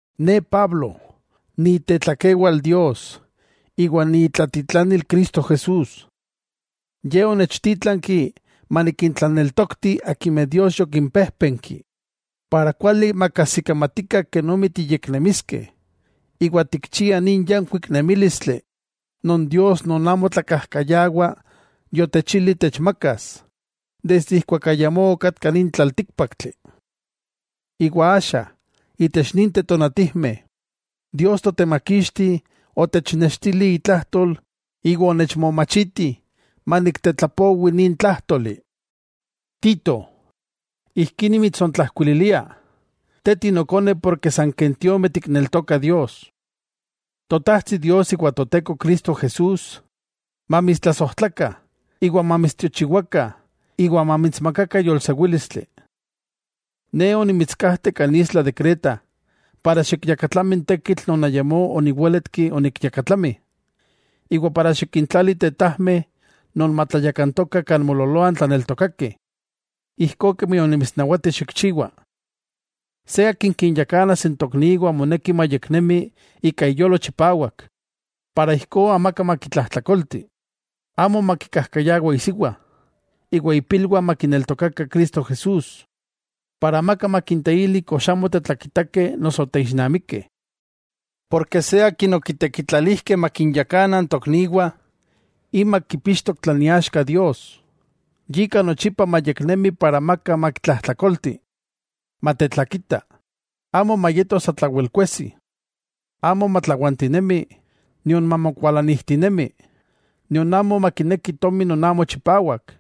Ne Pablo, ni itetlakewal Dios iwa ni itlatitlanil Cristo Jesús. Ye onechtítlanki manikintlaneltokti akimeh Dios yokimpéjpenki para kuali makajsikamatikah kenomi tiyeknemiskeh, iwa tikchiah nin yankuik nemílistli non Dios non amo tlakajkayawa yotechilih techmakas desde ijkuak ayamó okatka nin tlaltíkpaktli. Iwa axa, itech ninteh tonatijmeh, Dios Totemakixti otechnextili itlajtol iwa onechmomachiti maniktetlapowi nin tlájtoli. Tito, ijkí nimitsontlajkuililia, te tinokone porke san ken tiomeh tikneltokah Dios. Totajtsi Dios iwa Toteko Cristo Jesús mamitstlasojtlakah iwa mamitstiochiwakah iwa mamitsmakakah yolsewílistli. Ne onimitskajte kan isla de Creta para xikyakatlami n tekitl non ayakmó oniwéletki onikyakatlami, iwa para xikintlali tetajmeh non matlayakantokah kan moololoah n tlaneltokakeh, ijkó kemi onimitsnawati xikchiwa. Se akin kinyakanas n tokniwah moneki mayeknemi ika iyolo chipawak ijkó amaka makitlajtlakolti. Amo makikajkayawa isiwa, iwa ipilwah makineltokakah Cristo Jesús para amaka makinteili kox amo tetlakitakeh noso teixnamikeh. Porke, se akin okitekitlalijkeh makinyakana n tokniwah, imak kipixtok tlan iaxka Dios. Yika nochipa mayeknemi para amaka makitlajtlakolti. Matetlakita, amo mayeto satlawel kuejsi. Amo matlawantinemi nion mamokualanijtinemi, nion makineki tomi non amo chipawak.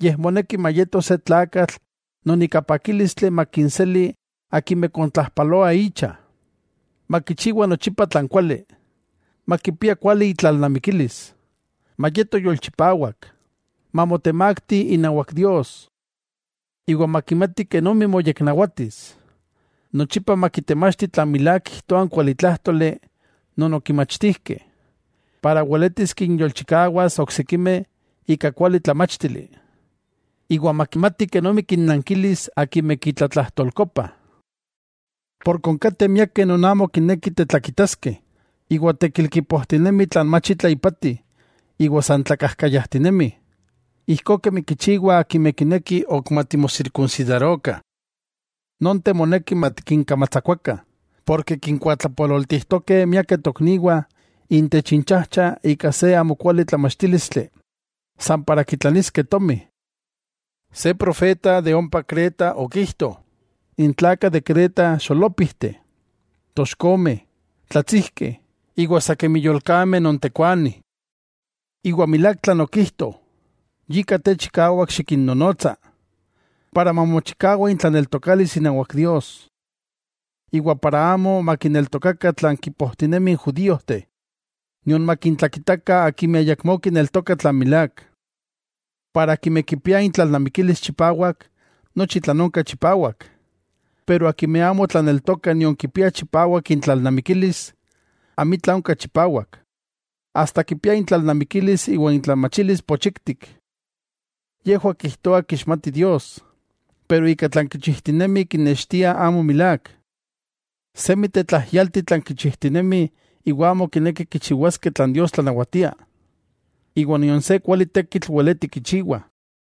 Yej moneki mayeto se tlakatl non ika pakílistli makinseli akimeh kontlajpaloah icha, makichiwa nochipa tlan kuali, makipia kuali itlalnamikilis, mayeto yolchipawak, mamotemakti inawak Dios, iwa makimati kenomi moyeknawatis. Nochipa makitemachti tlan milák kijtoa n kualitlájtoli non okimachtijkeh, para weletis kinyolchikawas oksikimeh ika kuali tlamáchtili, iwa makimati kenomi kinnankilis akimeh kitlajtolkokopah. Porke onkateh miakeh non amo kinekih tetlakitaskeh, iwa tekil kipojtinemih tlan mach itla ipati iwa san tlakajkayajtinemih, ijkó kemi kichiwah akimeh kinekih ok matimosirkunsidarokah. Nonteh moneki matikinkamatsakuakah, porke kinkuatlapololtijtokeh miakeh tokniwah intech inchajcha ika se amo kuali tlamachtílistli san para kitlaniskeh tomi. Se profeta de ompa Creta, okijto: “N tlakah de Creta xolópijteh, toxkomeh, tlatsijkeh, iwa sa kemi yolkameh non tekuani.” Iwa milák tlan okijto, yika te chikawak xikinnonotsa, para mamochikawa intlaneltokalis inawak Dios, iwa amo makineltokakah tlan kipojtinemih n judíojteh, nion makintlakitakah akimeh ayakmó kineltokah tlan milák. Akimeh kipia intlalnamikilis chipawak, nochi tlan onka chipawak, pero akimeh amo tlaneltokah nion kipia chipawak intlalnamikilis, amitla onka chipawak. Asta kipia intlalnamikilis iwa intlamachilis pochiktik. Yejwah kijtoah kixmatih Dios, pero ika tlan kichijtinemih kinextiah amo milák. Semi tetlajyalti tlan kichijtinemih iwa amo kinekih kichiwaskeh tlan Dios tlanawatia, iwa nion se kuali tekitl weletih kichiwah.